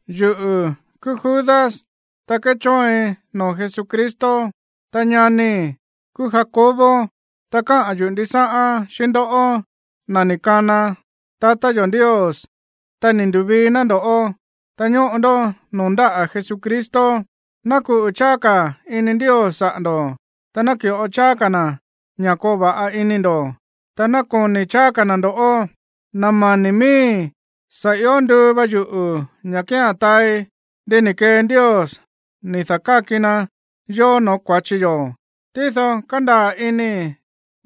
Yuꞌu̱ kúú Judas, ta kéchóoin noo̱ Jesucristo, ta ñanii̱ kúú Jacobo. Ta káꞌa̱n yuꞌu̱ ndisáꞌán xíꞌín ndoꞌó, na̱ ni̱ kana tatá yo̱ Ndios, ta ni̱ ndu̱vii ná ndo̱ꞌó, ta ñóꞌo ndó noo̱ ndáꞌa̱ Jesucristo. Ná kuꞌu̱ cháá ka̱ ini Ndios saꞌa̱ ndo̱, ta naki̱ꞌo cháá ka̱ na̱ ña̱ koo va̱ꞌa ini ndo̱, ta ná koni̱ cháá ka̱ na̱ ndo̱ꞌó. Na̱ mani̱ miíi̱, sa̱ io nduu va yuꞌu̱ ña̱ kía̱n taai ndi ni̱ kee Ndios ni̱ da̱káki na yó no̱ó kua̱chi yo̱. Tído kándaa̱ inii̱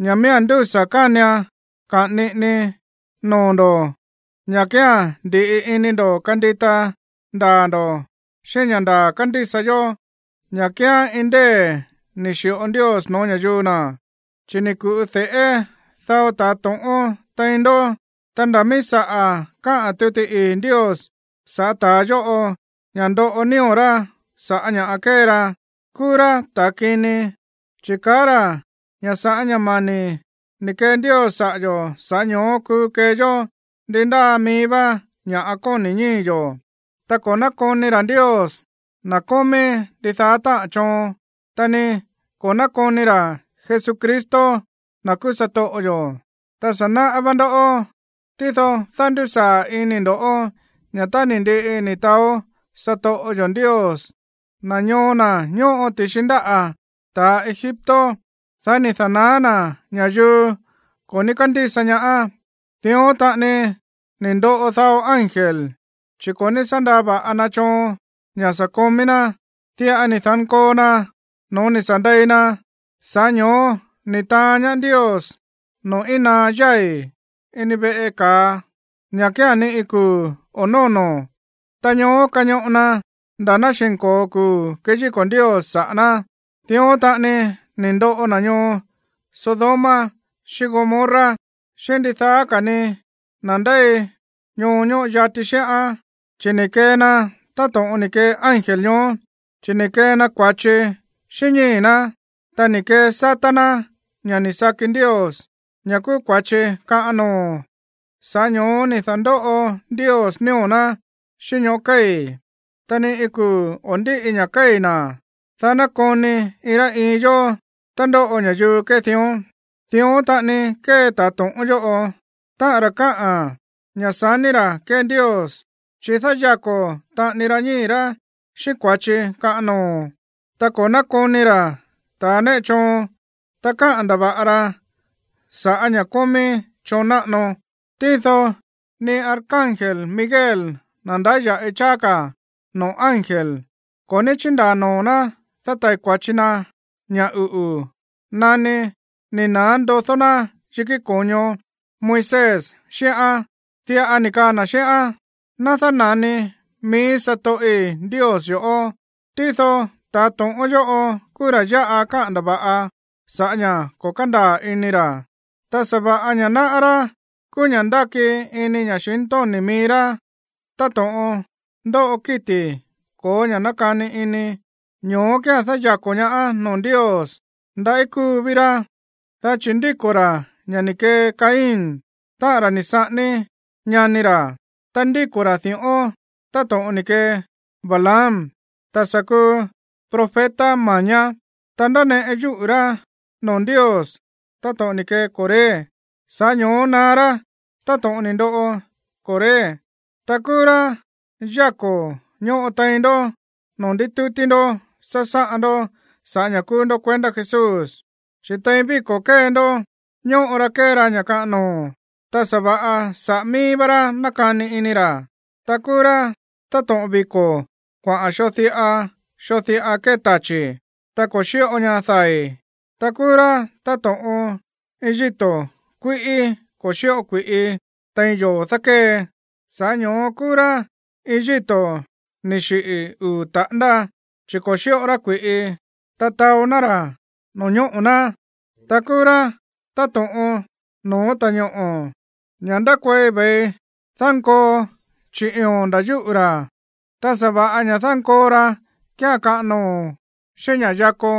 ña̱ miía̱n ndúsa̱ kánian kaꞌa̱n niꞌinii noo̱ ndo̱ ña̱ kía̱n ndi̱ꞌi ini ndo̱ kandita ndaa̱ ndo̱ xíꞌín ña̱ ndaa̱ kándísa yó, ña̱ kíán iin ndée̱ ni̱ xi̱ꞌo Ndios no̱ó ña̱yuu na̱. Chi̱ ni̱ ku̱ꞌu de̱ꞌé dao ta̱a to̱ꞌón tein ndó, ta nda̱ míí saꞌa̱ káꞌa̱n tuti ii̱ Ndios sa̱ꞌá ta̱a yóꞌo ña̱ ndoꞌo nío̱ rá sa̱ꞌá ña̱ kée ra. Kúú rá ta̱ kini, chi̱ kaá ra̱ ña̱ sa̱ꞌá ña̱ mani̱ ni̱ kee Ndios saꞌa̱ yo̱, sa̱ꞌá ño̱ó kuu kee yó ndi ndáa mií vá ña̱ꞌa kóni̱ ñíi̱ yo̱. Ta ko̱ nákoni ra̱ Ndios, na̱ kómí ndidaá táꞌa̱n choon, ta ni ko̱ nákoni ra̱ Jesucristo, na̱ kúú satoꞌo yo̱. Ta sa̱ náꞌá vá ndó, tído dándusaa̱ inii̱ ndo̱ꞌó ña̱ tá ni̱ ndiꞌi ni̱ taó satoꞌo yo̱ Ndios na̱ ñoo na̱ ñóꞌo ti̱xi ndáꞌa̱ ta̱ Egipto, dá ni̱ da̱naá na̱ ña̱yuu ko̱ ní kándísa ñaá. Dión taꞌani ni̱ ndoꞌo dao ángel, chi̱ ko̱ ní sá ndaa va̱ꞌa na choon sa̱ komí ná, diꞌa ni̱ da̱nkoo na no̱ó sa̱ ni̱ ndei na. Sa̱ꞌá ño̱ó ni̱ taán ñaá Ndios noo̱ íin naá yái̱, ini veꞌe ka̱a, ña̱ kía̱n ni kuu̱ o̱ nóno̱, ta ñoó kañoꞌo na nda̱ ná xi̱nko̱o kuu̱ keyíko̱ Ndios saꞌa̱ ná. Dión taꞌani ni̱ ndoꞌo na̱ ñoo Sodoma xíꞌín Gomorra, xíꞌín ndidaá ka̱ ni na̱ ndéi ñoo ñóꞌo yati xíꞌán. Chi̱ ni̱ kee na táto̱ꞌon ni̱ kee ángel ñoó, chi̱ ni̱ kee na kua̱chi xíꞌín ñíi̱ ná, ta ni̱ kesátá ná ña̱ ni̱ saki Ndios, ña̱ kúú kua̱chi kaꞌan noo̱. Sa̱ꞌá ño̱ó ni̱ da̱ndóꞌo Ndios nío̱ ná xíꞌín ñoꞌó kéi̱, ta ni iin kuu̱ o̱ ndíꞌi ña̱ kéi̱ na̱, dá ná koni iin rá iin yó tá ndóꞌo ña̱yuu kée dión. Dión taꞌani kée ta̱a to̱ꞌón yóꞌo, táꞌa̱n ra̱ kaá ña̱ sa̱ní ra̱ kée Ndios, chi̱ dáyako̱ taꞌani ra ñíi̱ rá xíꞌín kua̱chi kaꞌan noo̱, ta ko̱ nákoni ra̱ ta̱ néꞌe choon, ta káꞌa̱n ndava̱ꞌa ra sa̱ꞌá ña̱ kómí choon náꞌano. Tído ni arcángel Miguel, na̱ ndáya̱ꞌi cháá ka̱ noo̱ ángel, ko̱ ní chíndaa̱ noo̱ ná dátai̱ kua̱chi na ña̱ uꞌu̱ nani ni̱ na̱á ndodó na̱ yikí ko̱ño Moisés xíꞌán. Diꞌa ni̱ kaa na̱ xíꞌán: “Ná dána̱ni mií satoꞌi̱ Ndios yo̱ꞌó.” Tído ta̱ to̱ꞌón yóꞌo kúú ra̱ yáꞌa káꞌa̱n ndava̱ꞌa sa̱ꞌá ña̱ ko̱ kándaa̱ ini ra̱, ta sa̱va̱ꞌa ña̱ náꞌá rá kúú ña̱ ndáki ini ña̱xintóni̱ mií rá táto̱ꞌon ndóꞌo kíti̱ ko̱ó ña̱ nákani ini, ño̱ó kía̱n dáyako̱ ñaá noo̱ Ndios. ¡Ndaꞌí kúu ví rá! Dá chi̱ ndíko̱ ra̱ ña̱ ni̱ kee Caín, táꞌa̱n ra̱ ni̱ saꞌání ñani ra̱. Ta ndíko̱ ra̱ di̱ꞌón táto̱ꞌon ni̱ kee Balaam, ta̱ sa̱ kuu profeta ma̱ñá. Ta ndáneꞌe yúꞌu̱ rá noo̱ Ndios táto̱ꞌon ni̱ kee Coré, sa̱ꞌá ño̱ó naá rá táto̱ꞌon ni̱ ndoꞌo Coré. Ta kúú rá yáko̱ ñóꞌo tein ndoꞌó noo̱ ndítútí ndó sásáꞌan ndó sa̱ꞌá ña̱ kúú ndó kuendá Jesús, chi̱ tein víko̱ kée ndó ñóꞌo ra kée ra ña̱ kaꞌan noo̱, ta sa̱va̱ꞌa saꞌa̱ mií vá rá nákani ini ra̱. Ta kúú rá táto̱ꞌon viko̱ kuaꞌa̱n xoo diꞌa xoo diꞌa kée tachi̱, ta ko̱ xíꞌo ña dai̱. Ta kúú rá táto̱ꞌon iin yíto̱ kuíꞌí ko̱ xíꞌo kui̱ꞌi tein yoo̱ dákée. Sa̱ꞌá ño̱ó kúú rá iin yíto̱ ni̱ xiꞌi̱ uu̱ taꞌándá, chi̱ ko̱ xíꞌo rá kui̱ꞌi, ta taó ná ra̱ no̱ñóꞌo̱ ná. Ta kúú rá táto̱ꞌon no̱ó ta̱ñoꞌo̱, ña̱ ndákuei ve̱i dánkoo chiꞌi̱o̱n nda̱ yúꞌu̱ ra̱, ta sa̱va̱ꞌa ña̱ dánkoo rá kía̱n kaꞌan noo̱ xíꞌín ña̱ yakó.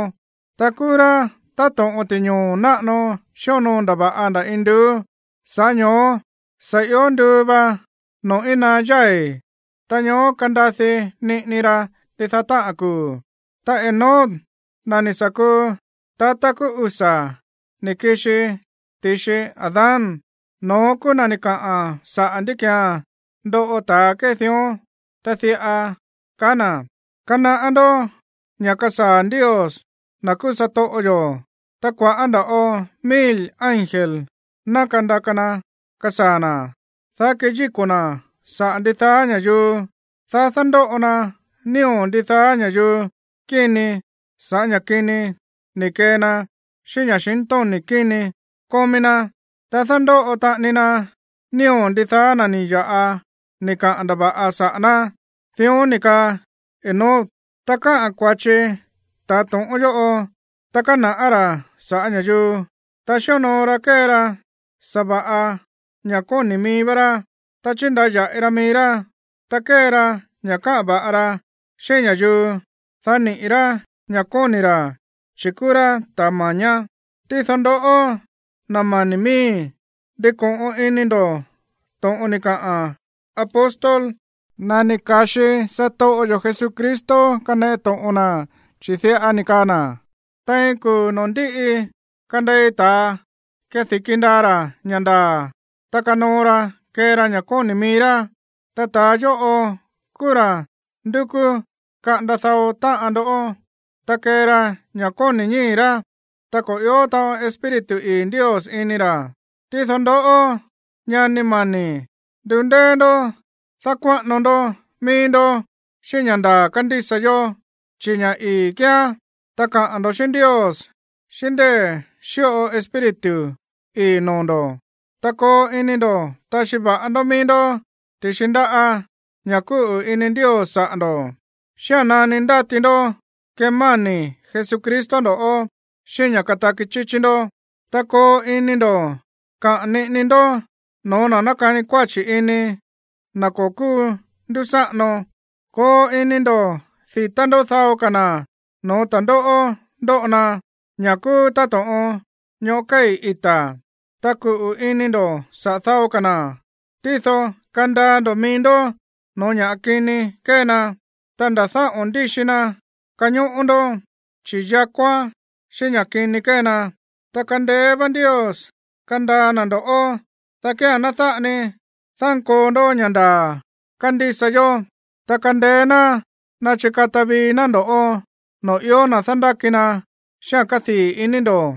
Ta kúú rá táto̱ꞌon ti̱ñoo̱ náꞌano xíonoo ndava̱ꞌa nda̱ induú. Sa̱ꞌá ño̱ó sa̱ ió nduu va noo̱ íin naá yái̱, ta ñoó kandadi niꞌini ra ndidaá táꞌa̱n kuu̱. Ta Enoc, na̱ ni̱ sa̱ kuu tata kúú usa̱ ni̱ kixi ti̱xi Adán, no̱ón kúú na̱ ni̱ kaꞌa̱n saꞌa̱ ndí ki̱án ndoꞌo ta̱ kée dión, ta diꞌa kaá na̱: “Kanaꞌá ndó ña̱ kasaa̱ Ndios, na̱ kúú satoꞌo yo̱, ta kua̱ꞌá nda̱ꞌo mil ángel ná kandaka na kasaa̱ na̱, dá keyíko̱ na̱ saꞌa̱ ndidaá ña̱yuu, dá dándóꞌo na nío̱ ndidaá ña̱yuu kíni sa̱ꞌá ña̱ kini ni̱ kee na xíꞌín ña̱xintóni̱ kíni kómí ná, ta dándóꞌo taꞌani na nío̱ ndidaá na̱ ni̱ ya̱ꞌa ni̱ kaꞌa̱n ndava̱ꞌa saꞌa̱ ná.” Dión ni̱ kaa Enoc. Ta káꞌa̱n kua̱chi ta̱ to̱ꞌón yóꞌo, ta kána̱ꞌá ra̱ sa̱ꞌá ña̱yuu, ta xíonoo ra kée ra sa̱va̱ꞌa ña̱ kóni̱ mií vá rá, ta chíndaya̱ꞌi ra mií rá, ta kée ra ña̱ káꞌa̱n va̱ꞌa ra xíꞌín ña̱yuu, dá niꞌi̱ rá ña̱ kóni̱ ra̱, chi̱ kúú rá ta̱ ma̱ñá. Tído ndoꞌó, na̱ mani̱ miíi̱, ndiko̱ꞌon ini ndo̱ to̱ꞌon ni̱ kaꞌa̱n apóstol, na̱ ni̱ ka̱xi satoꞌo yo̱ Jesucristo kaneꞌe to̱ꞌon na, chi̱ diꞌa ni̱ kaa na̱: “Tein kuu̱ noo̱ ndíꞌi kandei ta̱a kedi̱ki ndaa ra̱ ña̱ ndaa̱, ta kanoo ra kee ra ña̱ kóni̱ mií rá.” Ta ta̱a yóꞌo kúú ra̱ ndúkú kaꞌanda dao táꞌan ndó, ta kée ra ña̱ kóni̱ ñíi̱ rá, ta ko̱ i̱ó taꞌon Espíritu ii̱ Ndios ini ra̱. Tído ndoꞌó, ñani mani̱, ndundéé ndó dákuáꞌano ndó mií ndó xíꞌín ña̱ ndaa̱ kándísa yó, chi̱ ña̱ ii̱ kíán. Ta kaꞌa̱n ndo̱ xíꞌín Ndios xíꞌín ndée̱ xíꞌo Espíritu ii̱ noo̱ ndo̱. Ta koo ini ndo̱ taxi va̱ꞌa ndó mií ndó ti̱xi ndáꞌa̱ ña̱ kúꞌu̱ ini Ndios saꞌa̱ ndo̱, xía̱n nani ndáti ndó kemáni̱ Jesucristo ndo̱ꞌó xíꞌín ña̱ kataki chíchí ndó. Ta koo ini ndo̱ kaꞌa̱n niꞌini ndó no̱ó na̱ nákani kuáchi̱ ini, na̱ ko̱ kúú ndúsáꞌano. Koo ini ndo̱ di̱tá ndó dao ka̱ na̱ no̱ó ta̱ndóꞌó ndóꞌo na, ña̱ kúú táto̱ꞌon ñoꞌó kéi̱ ita̱. Ta kuꞌu̱ ini ndo̱ saꞌa̱ dao ka̱ na̱, tído kandaa ndo̱ mií ndó no̱ó ña̱ kini kée na, ta nda̱ dáꞌo̱n ndíxi na kañóꞌó ndó, chi̱ yakóán xíꞌín ña̱ kini kée na. Ta kándéé vá Ndios kandaa na̱ ndo̱ꞌó, dá kía̱n ná dáꞌa ni dánkoo ndó ña̱ ndaa̱ kándísa yó, ta kándéé ná ná chikata vii ná ndo̱ꞌó noo̱ ió na̱ dándáki na xíꞌa̱n kádii̱ iní ndo̱.